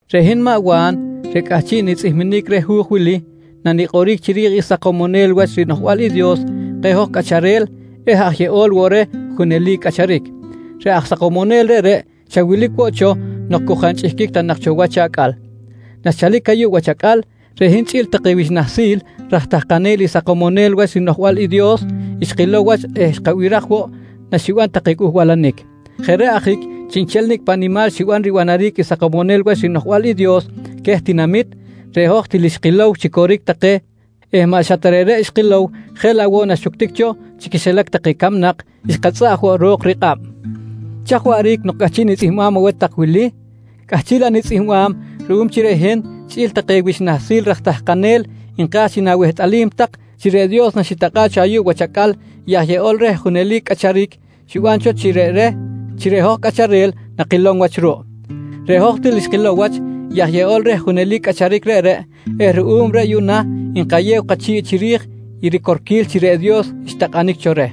Reꞌ hin maꞌ Wa̱n reꞌ cꞌahchiꞌ nitzꞌihminic reh hu̱j wili nanikꞌoric chiri̱j i Sakomonel Wach riNoꞌjbal i Dios keh hoj cꞌacharel eh aj Yeꞌol woꞌ reh Junelic Cꞌacharic. Reꞌ aj Sakomonel reꞌreꞌ xa wilic woꞌ cho nok cu jaꞌ nchꞌihquic ta cho wach acꞌal. Naxchalic ayuꞌ wach acꞌal, reꞌ hin chꞌi̱l take wich nahsil raj tahkanel i Sakomonel Wach riNoꞌjbal i Dios, xkilow wach eh xkabiraj woꞌ naxiban take cꞌuhbalanic. Jeꞌ reꞌ ajic chiꞌnchel nicꞌ paꞌ nimal xiban ribanaric i Sakomonel Wach riNoꞌjbal i Dios queh tinamit, reꞌ hoj til xkilow chi coric take eh maꞌ xa ta reꞌreꞌ xkilow jeꞌ laꞌ woꞌ naxuctic cho chi quixilac take camnak, xkatzꞌaꞌj woꞌ ro̱k rikꞌab. Chaj waꞌric nok cꞌahchiꞌ nitzꞌihmbam aweh tak i wili? Cꞌahchiꞌ laꞌ nitzꞌihmbam ruꞌum chi reꞌ hin chꞌi̱l take wich nahsil raj tahkanel nka̱j chi nawehtꞌalij tak chi reꞌ Dios naxitakꞌa̱ꞌ cho ayuꞌ wach acꞌal i aj Yeꞌol reh Junelic Cꞌacharic, xiban cho chi jeꞌ reꞌ reh chi reꞌ hoj cꞌacharel nakilom wach ruꞌ. Reꞌ hoj til xkilow wach i aj Yeꞌol reh Junelic Cꞌacharic reꞌreꞌ eh ruꞌum reꞌ yuꞌna nkayew kachi̱ꞌ chiri̱j i ricorquil chi reꞌ Dios xtakꞌanic cho reh.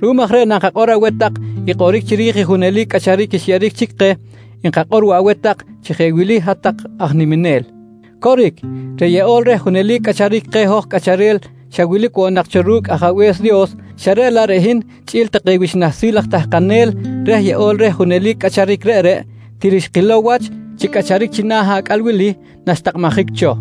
Ruꞌum aj reꞌ nankakꞌor aweh tak i kꞌoric chiri̱j i junelic cꞌacharic xyeꞌeric chic keh, nkakꞌor woꞌ aweh tak chi jeꞌ wili hat-tak aj niminel: Coric, reꞌ Yeꞌol reh Junelic Cꞌacharic keh hoj cꞌacharel xa wilic woꞌ nak cho ru̱cꞌ Ajabe̱s Dios xa reꞌ laꞌ reꞌ hin chꞌi̱l take wich nahsil aj tahkanel reh Yeꞌol reh Junelic Cꞌacharic reꞌreꞌ, til xkilow wach chi cꞌacharic china̱ acꞌal wili naxtakꞌabjic cho.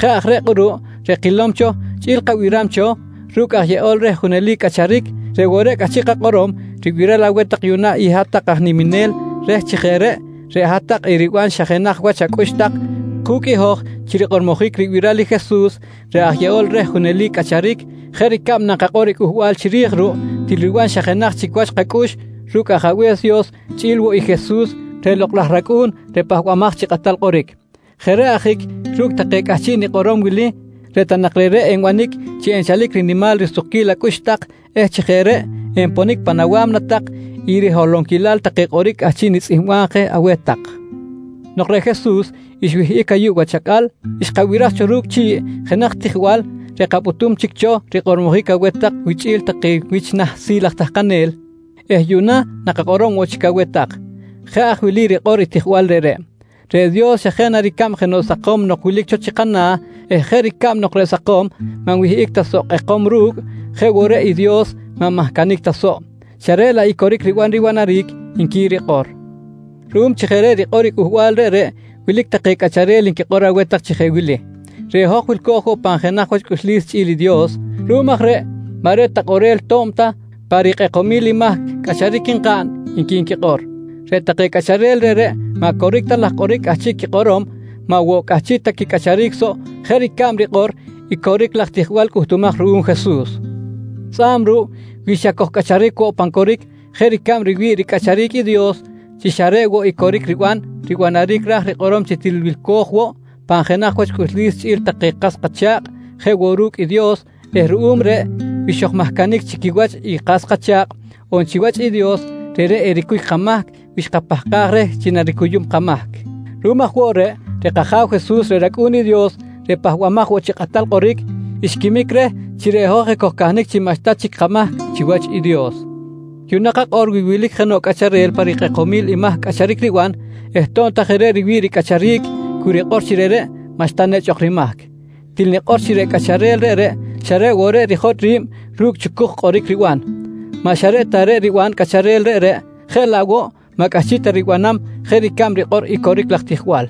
Jeꞌ aj reꞌ kꞌuruꞌ reꞌ kilom cho chꞌi̱l kabiram cho ru̱cꞌ aj Yeꞌol reh Junelic Cꞌacharic, reꞌ woꞌ reꞌ cꞌahchiꞌ kakꞌorom ribiral aweh yuꞌna i hat-tak aj niminel reh chi jeꞌ reꞌ, reꞌ hat-tak eriban xa jenaj wach acꞌux tak ku̱cꞌ i hoj chi rikꞌormojic ribiral i Jesus reꞌ aj Yeꞌol reh Junelic Cꞌacharic jeꞌ ricab nankakꞌor i cꞌuhbal chiri̱j ruꞌ, til riban xa jenaj chic wach kacꞌux ru̱cꞌ Ajabe̱s Dios chꞌi̱l woꞌ i Jesus reꞌ Lokꞌ laj rAcꞌu̱n reꞌ Pahbamaj chi Kꞌatal Kꞌoric. Jeꞌ reꞌ ajic ru̱cꞌ take cꞌahchiꞌ nikꞌorom wili reꞌ ta nak reꞌreꞌ enbanic chi enchalic rinimal risukquil acꞌux tak eh chi jeꞌ reꞌ enponic pan awa̱mna tak i riholonquilal take kꞌoric cꞌahchiꞌ nitzꞌihmbam je aweh tak. Nok reꞌ Jesus xwihꞌic ayuꞌ wach acꞌal, xkabiraj cho ru̱cꞌ chi̱ꞌ jenaj tijbal reꞌ kapꞌutum chic cho rikꞌormojic aweh tak wichꞌi̱l take wich nahsil aj tahkanel eh yuꞌna nakakꞌorom woꞌ chic aweh tak. Jeꞌ aj wili rikꞌor i tijbal reꞌreꞌ: «Reꞌ Dios, xa jeꞌ na ricab jenoꞌ sakom nok wilic cho chi kana̱ eh jeꞌ ricab nok reꞌ sakom maꞌ nwihꞌic ta soꞌ kꞌekom ru̱cꞌ jeꞌ woꞌ reꞌ i Dios maꞌ nmahcanic ta soꞌ xa reꞌ laꞌ i coric riban ribanaric, nqui rikꞌor. Ruꞌum chi jeꞌ reꞌ rikꞌor i cꞌuhbal reꞌreꞌ wilic take cꞌacharel nquikꞌor aweh tak chi jeꞌ wili: «Reꞌ hoj wilco̱j pan jenaj wach cꞌuxlis chꞌi̱l i Dios. Ruꞌum aj reꞌ maꞌ reꞌ ta kꞌorel to̱b ta pa rikꞌekomil i mahc cꞌacharic nkaꞌn, nqui nquikꞌor. Reꞌ take cꞌacharel reꞌreꞌ maꞌ coric ta laj kꞌoric cꞌahchiꞌ quikꞌorom, maꞌ woꞌ cꞌahchiꞌ ta quicꞌacharic soꞌ jeꞌ ricab rikꞌor i coric laj tijbal cꞌuhtumaj ruꞌum Jesus. Tzꞌa̱b ruꞌ, wi xa kojcꞌacharic woꞌ pan coric jeꞌ ricab riwi̱ꞌ ricꞌacharic i Dios chi xa reꞌ woꞌ i coric riban ribanaric ra̱j rikꞌorom chi til wilco̱j woꞌ pan jenaj wach cꞌuxlis quichꞌi̱l take kas kacha̱kꞌ jeꞌ woꞌ ru̱cꞌ i Dios eh ruꞌum reꞌ, wi xojmahcanic chi quiwach i kas kacha̱kꞌ on chiwach i Dios, reꞌreꞌ ericuy kamahc wi xkapahkaj reh chi naricuyum kamahc. Ruꞌum aj woꞌ reꞌ, reꞌ kAja̱w Jesus reꞌ rAcꞌu̱n i Dios reꞌ Pahbamaj woꞌ chi Kꞌatal Kꞌoric, xquimic reh chi reꞌ hoj ekojcahnic chi maꞌxta chic kamahc chiwach i Dios. Yuꞌna kakꞌor wi wilic jenoꞌ cꞌacharel pa rikꞌekomil i mahc cꞌacharic riban eh to̱b ta jeꞌ reꞌ riwi̱ꞌ ricꞌacharic cu rikꞌor chi reꞌreꞌ maꞌxta nechꞌ ok rimahc. Til nikꞌor chi reꞌ cꞌacharel reꞌreꞌ xa reꞌ woꞌ reꞌ rijotꞌ ri̱b ru̱cꞌ chucuj kꞌoric riban. Maꞌ xa reꞌ ta reꞌ riban cꞌacharel reꞌreꞌ, jeꞌ laꞌ woꞌ maꞌ cꞌahchiꞌ ta ribanam jeꞌ ricab rikꞌor i coric laj tijbal.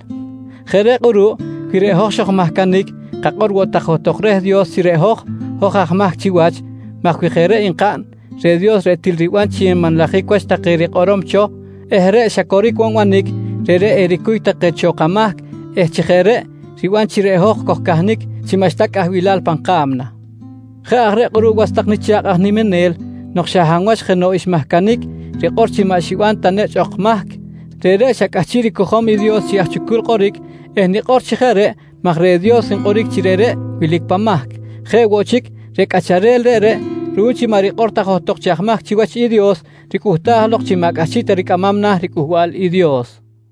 Jeꞌ reꞌ kꞌuruꞌ wi reꞌ hoj xojmahcanic kakꞌor woꞌ tak johtok reh i Dios chi reꞌ hoj, hoj aj mahc chiwach maj wi jeꞌ reꞌ nkaꞌn reꞌ Dios reꞌ til riban chi nmanlajic wach take rikꞌorom cho eh reꞌ xa coric woꞌ nbanic, reꞌreꞌ ericuy take cho kamahc eh chi jeꞌ reꞌ, riban chi reꞌ hoj kojcahnic chi maꞌxta cꞌahbilal pan ka̱mna. Jeꞌ aj reꞌ kꞌuruꞌ was tak nicha̱kꞌ aj niminel, nok xa hab wach jenoꞌ xmahcanic rikꞌor chi maꞌ xiban ta nechꞌ ok mahc, reꞌreꞌ xa cꞌahchiꞌ ricojom i Dios chi aj chucul kꞌoric eh nikꞌor chi jeꞌ reꞌ maj reꞌ woꞌ Dios nkꞌoric chi reꞌreꞌ wilic pan mahc. Jeꞌ woꞌ chic, reꞌ cꞌacharel reꞌreꞌ ruꞌum chi maꞌ rikꞌor ta johtok chi aj mahc chiwach i Dios ricꞌuhtaj lok chi maꞌ cꞌahchiꞌ ta ricꞌamam na̱ riCꞌuhbal i Dios.